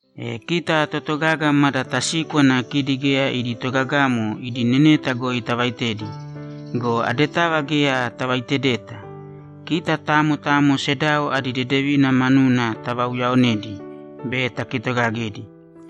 E kita totogaga mada tasíkwana kidi geya idi togagamo idi neneta goi tavaitedi go, adetava geya tavauyaonedeta. Kita tamo tamo sedao adi dedevina manuna tavauyaonēdi be takitogagēdi.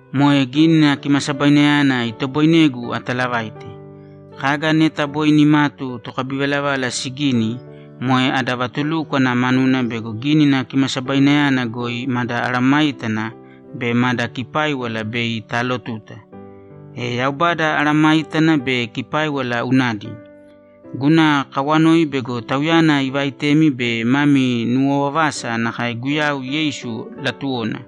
Moe Gínina Kimasabainayana itoboinegu atalavaite. Kaga neta boi nimatu tokabivalavala sigini, moe ada vatulúkwana manuna bego Gínina Kimasabainayana goi mada mesayágana be mada kipáiwala bei taalotuta. E Yaubada mesayágana be kipáiwala unadi. Guna kawanoi bego Tauyana ivaitemi be mami nuwovavasa nakae Guyau Yeisu latuwona.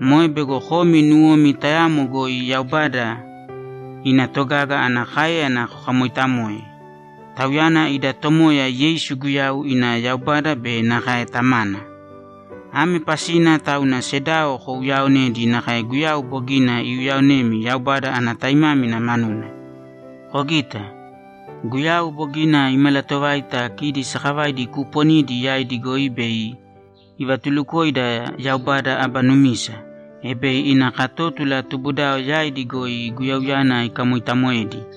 Moe bego komi nuwomi tayamo goi Yaubada ina togaga ana káeyana kokamoitamoe. Tauyana ida Tomoya Yeisu Guyau ina Yaubada be nakae Tamana. Ame pasina tauna sedao kouyaonēdi nakae Guyau bogina iuyaonemi Yaubada ana taimámina manuna. Kogita. Guyau bogina imalatovaita kidi sakavaidi kuuponidi yaidi goi bei ivatulukoida Yaubada aba numisa, e bei ina katótula tubudao yaidi goi Guyauyana ikamoitamoedi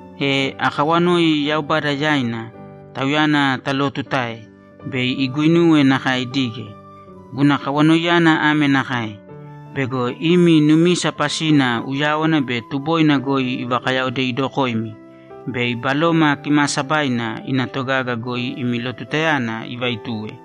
E akawanoi Yaubada yaina, Tauyana talootutae, bei iguinuwe nakae idige. Guna kawanoiyana ame nakae: Bego imi numisa pasina uyáwana be tuboina goi ivakayaodeidokoimi be Baloma Kimaasabaina ina togaga goi imi lotutayana ivaituwe.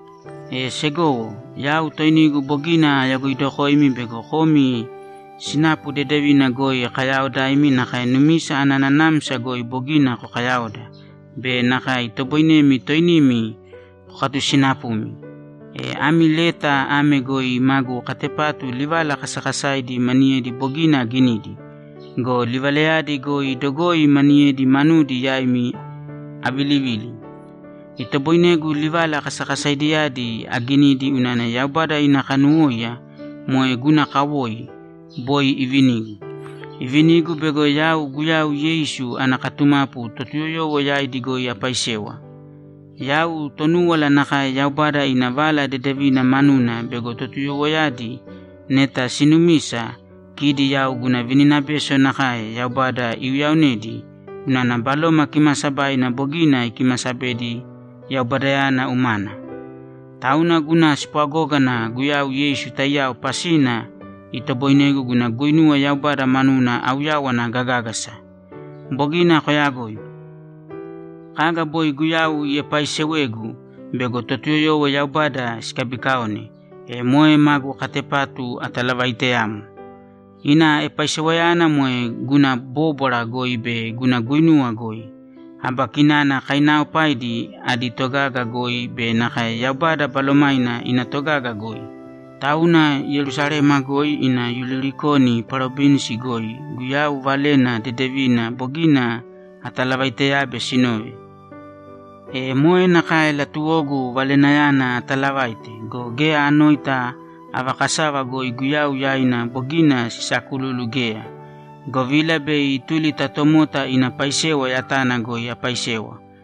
E segowo, yau toinigu bogina ayagoidokoimi bego komi sinapu dedevina goi kayaaodaimi nakae numisa ana nanamsa goi bogina kokayaoda be nakae itoboinemi toinimi kokatusinapumi. E ami leta ame goi magu katepatu livala kasakasaidi maniyedi bogina aginidi go, livalayadi goi dogoi maniyedi manudi yaimi avilivili. Itoboinegu livala kasakasaidiyadi aginidi unana Yaubada ina kanuwóiya, moe guna kawoi, boi ivinigu. Ivinigu bego yau Guyau Yeisu ana katumapu Totuyoyowo yaidi goi apaisewa. Yau Tonúwala nakae Yaubada ina Vala Dedevina manuna bego Totuyoyowoyadi neta sinumisa, kidi yau guna vininabeso nakae Yaubada iuyaonedi unana Baloma Kimaasabaina bogina ikimasabedi Yaubadayana umana. Tauna guna spwagógana Guyau Yeisu taiyao pasina itoboinegu guna guinuwa Yaubada manuna auyawana gagágasa. Bogina koyagoi. Kaga boi Guyau iepaaisewegu bego Totuyoyowo Yaubada sikabikaone, e moe magu katepatu atalavaiteyamo. Ina epaisewayana moe guna bóbwara goi be guna guinuwa goi, aba kinana kainaaopaidi adi togaga goi be nakae Yaubada Balomaina ina togaga goi. Tauna Yerusalema goi ina Ilurikoni parovinsi goi Guyau Valena Dedevina bogina atalavaiteyabe sinove. E moe nakae latuwogu Valenayana atalavaite go, geya anoita ava kasava goi Guyau yaina bogina sisaakululu geya, govila bei ituli ta tomota ina paisewa yatana goi apaisewa,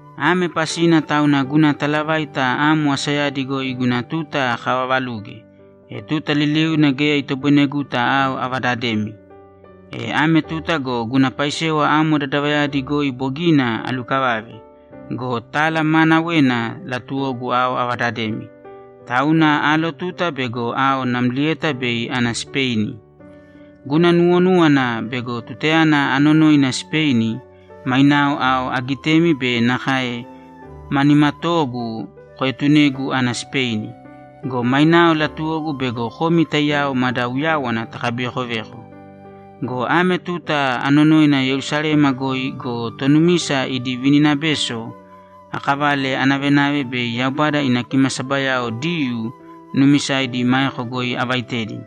Ame pasina tauna guna talavaita amo asayadi goi guna tuta akavavaluge, e tuta liliuna geya itoboineguta ao avadademi. E ame tuta go guna paisewa amo dadavayadi goi bogina alukavave go, tala maanawena latuwogu ao avadademi, tauna aalotuta bego ao namlieta bei ana Sipeini. Guna nuwonúwana bego tutayana anonoina Sipeini, mainao ao agitemi be nakae ma nimatoogu koetunegu ana Sipeini. Go mainao latuwogu bego komi taiyao mada uyáwana takabivekoveko. Go ame tuta anonoina Yerusalema goi go, tonumisa idi vininabeso akavale anavenave bei Yaubada ina kimasabayao Diyuu nuumisaidi maeko goi avaitedi.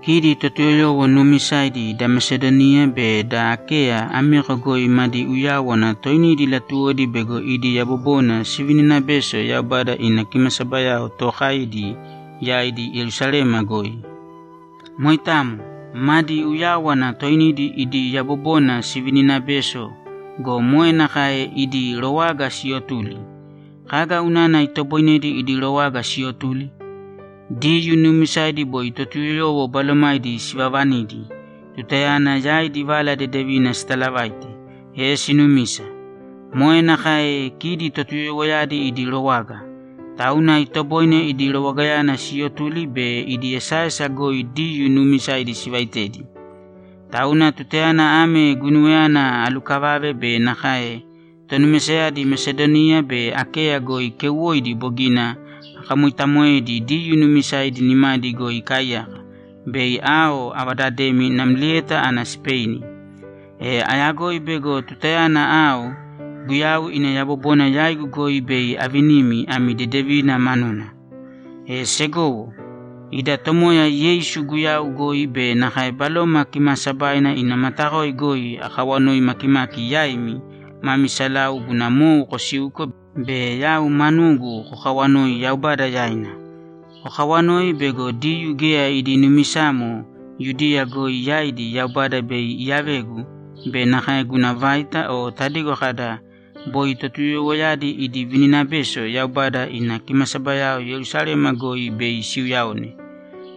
Kidi Totuyoyowo nuumisaidi da Mesadoniya be da Akeya ameko goi madi uyáwana toinidi latuwodi bego idi yabobona sivininabeso Yaubada ina kimasabayao tookaidi yaidi Yerusalema goi. Moitamo. Madi uyáwana toinidi idi yabobona sivininabeso go, moe nakae idi rowaga siyotuli. Kaga unana itoboinedi idi rowaga siyotuli? Diyuu nuumisaidi boi Totuyoyowo balomaidi sivavanidi tutayana yaidi Vala Dedevina sitaalavaite, e sinumisa. Moe nakae kidi Totuyoyowoyadi idi rowaga. Tauna itoboine idi rowagayana siyotuli be idi esaesa goi Diyuu nuumisaidi sivaitedi. Tauna tutayana ame guinuwayana alukavave be nakae tonumisayadi Mesadoniya be Akeya goi keuwoidi bogina akamoitamoedi Diyuu nuumisaidi nimadi goi ikaaiyaka, bei ao avadademi namlieta ana Sipeini. E ayagoi bego tutayana ao, Guyau ina yabobona yaigu goi bei avinimi ami dedevina manuna. E segowo, ida Tomoya Yeisu Guyau goi be nakae Baloma Kimaasabaina ina matakoi goi akawanoi makimaki yaimi mami salau guna mou kosiuko be yau manugu kokawanoi Yaubada yaina. Kokawanōi bego Diyuu geya idi numisamo Yudiya goi yaidi Yaubada bei iyavegu be nakae guna vaita o tadigo kada, ‘Boi Totuyoyowoyadi idi vininabeso’ Yaubada ina kimasabayao Yerusalema goi bei siuyaone.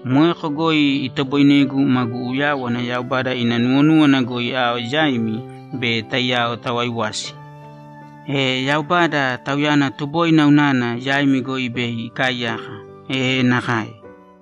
Moeko goi itoboinegu magu uyáwana Yaubada ina nuwonúwana goi ao yaimi be taiyao tawaiwasi. E Yaubada, Tauyana tuboina unana, yaimi goi bei ikaaiyaka. E nakae!